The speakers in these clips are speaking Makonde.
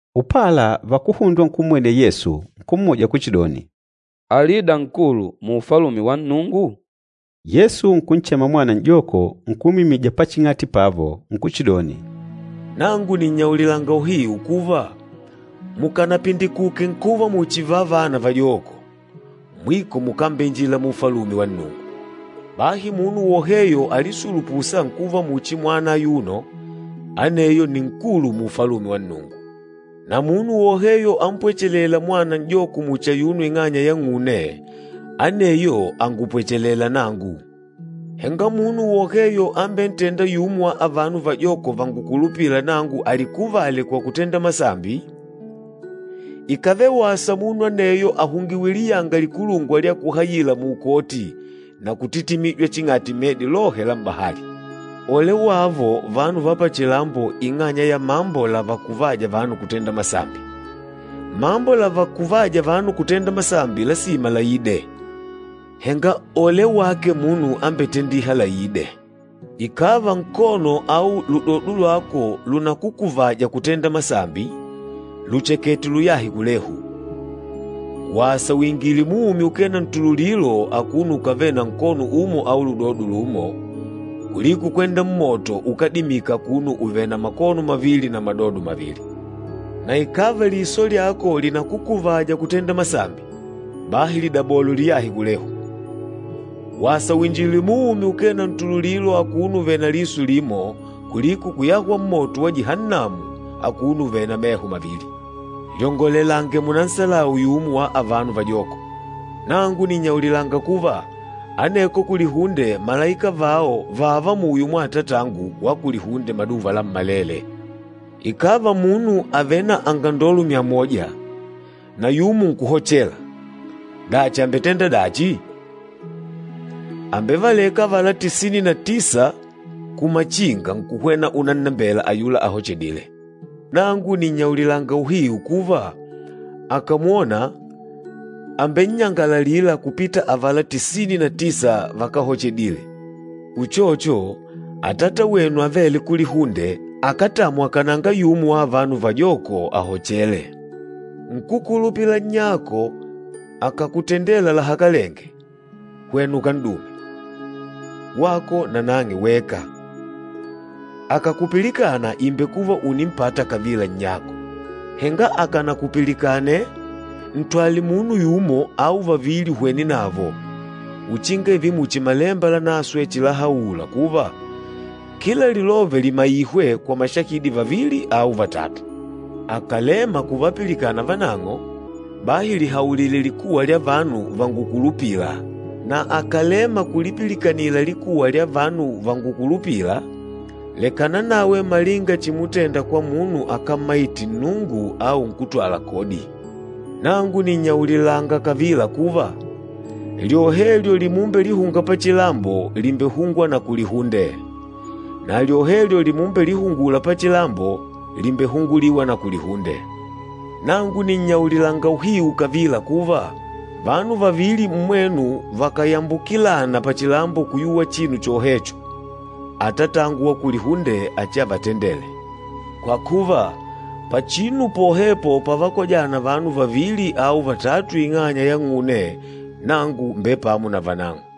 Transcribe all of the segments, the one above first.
Upala vakuhundwa nkummwenela Yesu, nkummuja kuchidoni, “Alida nkulu mu Ufalume wa Nnungu?” Yesu nkunchema mwana n'joko nkumwimija paching'ati pavo, nkuchidoni, “Nangu nìnnyaulilanga uhiu kuva, mukanapindikuke nkuva muchi vavana vajoko, mwiko mukambeinjila mu Ufalume wa Nnungu. Bahi munu woheyo alisulupûsa nkuva muchi mwana ayuno, aneyo nni nkulu mu Ufalume wa Nnungu. Na munu woheyo ampwechelêla mwana n'joko muchi ayuno ing'anya yang'une, aneyo angupwechelêla nangu.” “Henga munu woheyo ambentênda yumo wa avano vajoko vangukulupîla nangu alikuvale kwa kutenda masambi, ikàvele wasa munu aneyo ahungiwe liyanga likulungwa lya kuhayila muukoti na kutitimijwa ching'ati medi lohe la m'bahali. Ole wavo vanu va pachilambo ing'anya ya mambo lavakuvâja vanu kutenda masambi! Mambo lavakuvâja vanu kutenda masambi lasima laide, henga ole wake munu ambetendîha laide!” “Ikàva nkono au ludodo lwako lunakukuvaja kutenda masambi, luchekete uluyahe kulehu. Wasa wingile muumi ukee na ntululilo akuno ukavèlè na nkono umo au ludodo lumo, kuliko kwenda mmoto ukádimika akuno uvèlè na makono mavili na madodo mavili. Na ikàva liso lyako linakukuvaja kutenda masambi, bahi lidabole uliyahe kulehu! Wasa uinjile muumi ukee na ntululilo akuno uvèlè na liso limo kuliko kuyahwa mmoto wa Jihannamu akuno uvèlè na meho mavili.” “Lyongolelange munanhebule yumo wa avano vajoko. Nangu nìnnyaulilanga kuva, aneko kulihunde malaika vao vààva muyo mwa Atatangu wa kulihunde maduva lammalele. Ikàva munu àvele na angandolo myamoja, na yumo nkuhochela, dachi àmbetenda dachi? Àmbevaleka avala tisini na tisa kumachinga nkuhwena unannembela ayula ahochedîle. Nangu nìnnyaulilanga uhiu kuva, akàmwona, àmbennyangalalila kupita avala tisini na tisa vakáhochedile. Uchocho, Atata wenu avêle kulihunde akátamwa kananga yumo wa avano vajoko ahochele.” “Nkúkulupila nnyako akàkutendela lahakalenge, hwena ukan'dume, wako na nang'e weka. Akàkupilikana ìmbekuva ùnimpata kavila nnyako. Henga akànakupilikane, ntwale munu yumo au vavili uhwene navo, uchinga ììve muchi Malemba Lanaswe chilahaula kuva, kila lilove limaihwe kwa mashahidi vavili au vatatu. Akàlema kuvapilikana vanang'o, bahi lihaulile likuwa lya vanu vangukulupîla, na akàlema kulipilikanila likuwa lya vanu vangukulupîla, lekana nawe malinga chimutenda kwa munu akámmaite Nnungu au nkútwala kodi. Nangu nìnnyaulilanga kavila kuva, lyohelyo limumbelihunga pachilambo lìmbehungwa na kulihunde, na lyohelyo limumbelihungula pachilambo lìmbehunguliwa na kulihunde. Nangu nìnnyaulilanga uhiu kavila kuva, vanu vavili mmwenu vakàyambukilana pachilambo kuyuwa chinu chohecho, Atatangu wa kulihunde achiavatendele. Kwa kuva, pachinu pohepo pavakojana vanu vavili au vatatu ing'anya yang'une, nangu mbèpamo na vanang'o.”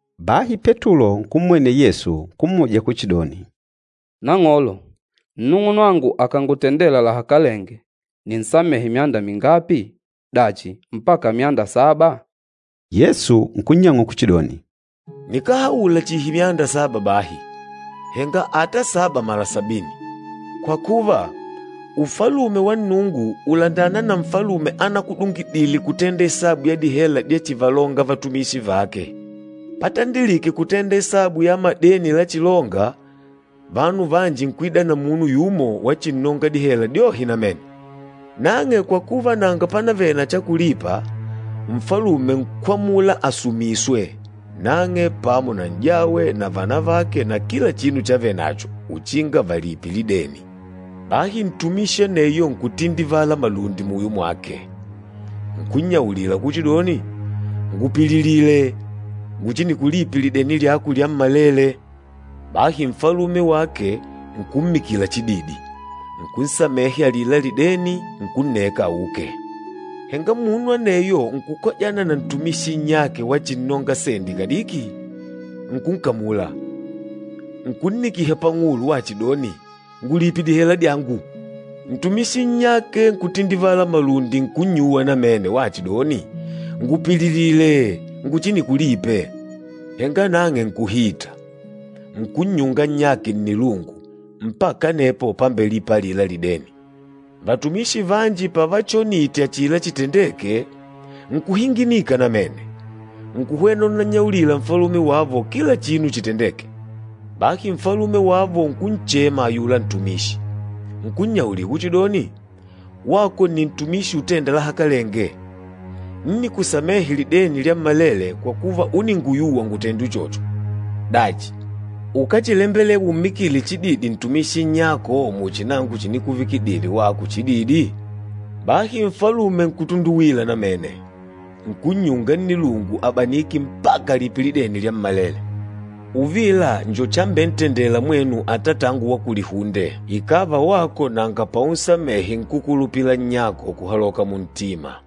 Bahi Petulo nkummwenela Yesu, nkummuja kuchidoni, “Nang'olo, nnung'unwangu akàngutendela lahakalenge, ninsamehe myanda mingapi? Dachi mpaka myanda saba?” Yesu nkunnyang'ula kuchidoni, “Nikáhaula chihi myanda saba bahi, henga ata saba mala sabini. Kwa kuva, Ufalume wa Nnungu ùlandana na nfalume anakudungidile kutenda isabu ya dihela dyachivalonga vatumishi vake. Patandilike kutenda isabu ya madeni lachilonga, vanu vanji nkuida na munu yumo wachinnonga dihela dyohe namene. Nang'e kwa kuva nanga pánavèlè na cha kulipa, nfalume nkwamula asumiswe, nang'e pamo na n'jawe na vanavake na kila chinu chavenacho, uchinga valipe lideni. Bahi ntumishi aneyo nkutindivala malundi muyo mwake, nkunnyaulila kuchidoni, ‘Ngupililile, nguchinikulipe lideni lyako lyammalele.’ Bahi nfalume wake nkummikila chididi, nkunsamehe alila lideni, nkunneka auke. Henga munu aneyo nkukojana na ntumishi nnyake wachinnonga sendi kadiki. Nkunkamula, nkunnikiha pang'ulo, wachidoni, ‘Ngulipe dihela dyangu!’ Ntumishi nnyake nkutindivala malundi nkunnyuwa namene wachidoni, ‘Ngupililile, nguchinikulipe.’ Henga nang'e nkuhita, nkunnyunga nnyake nnilungu, mpaka anepo pámbelìpà alila lideni. Vatumishi vanji pavachonite achila chitendeke, nkuhinginika namene, nkuhwena unannyaulila nfalume wavo kila chinu chitendêke. Bahi nfalume wavo nkunchema ayula ntumishi, nkunnyaulila kuchidoni, ‘Wako nni ntumishi utênda lahakalenge. Ńnikusamehe lideni lyammalele kwa kuva uninguyuwa ngutende uchocho. Dachi, ukáchilembelewa ummikile chididi ntumishi nnyako muchi nangu chinikuvikidile wako chididi?’ Bahi nfalume nkutunduwila namene, nkunnyunga nnilungu abanike mpaka alipe lideni lyammalele. Uvila njo chambentendela mwenu Atatangu wa kulihunde, ikàva wako nanga paunsamehe nkúkulupila nnyako kuhaloka muntima.”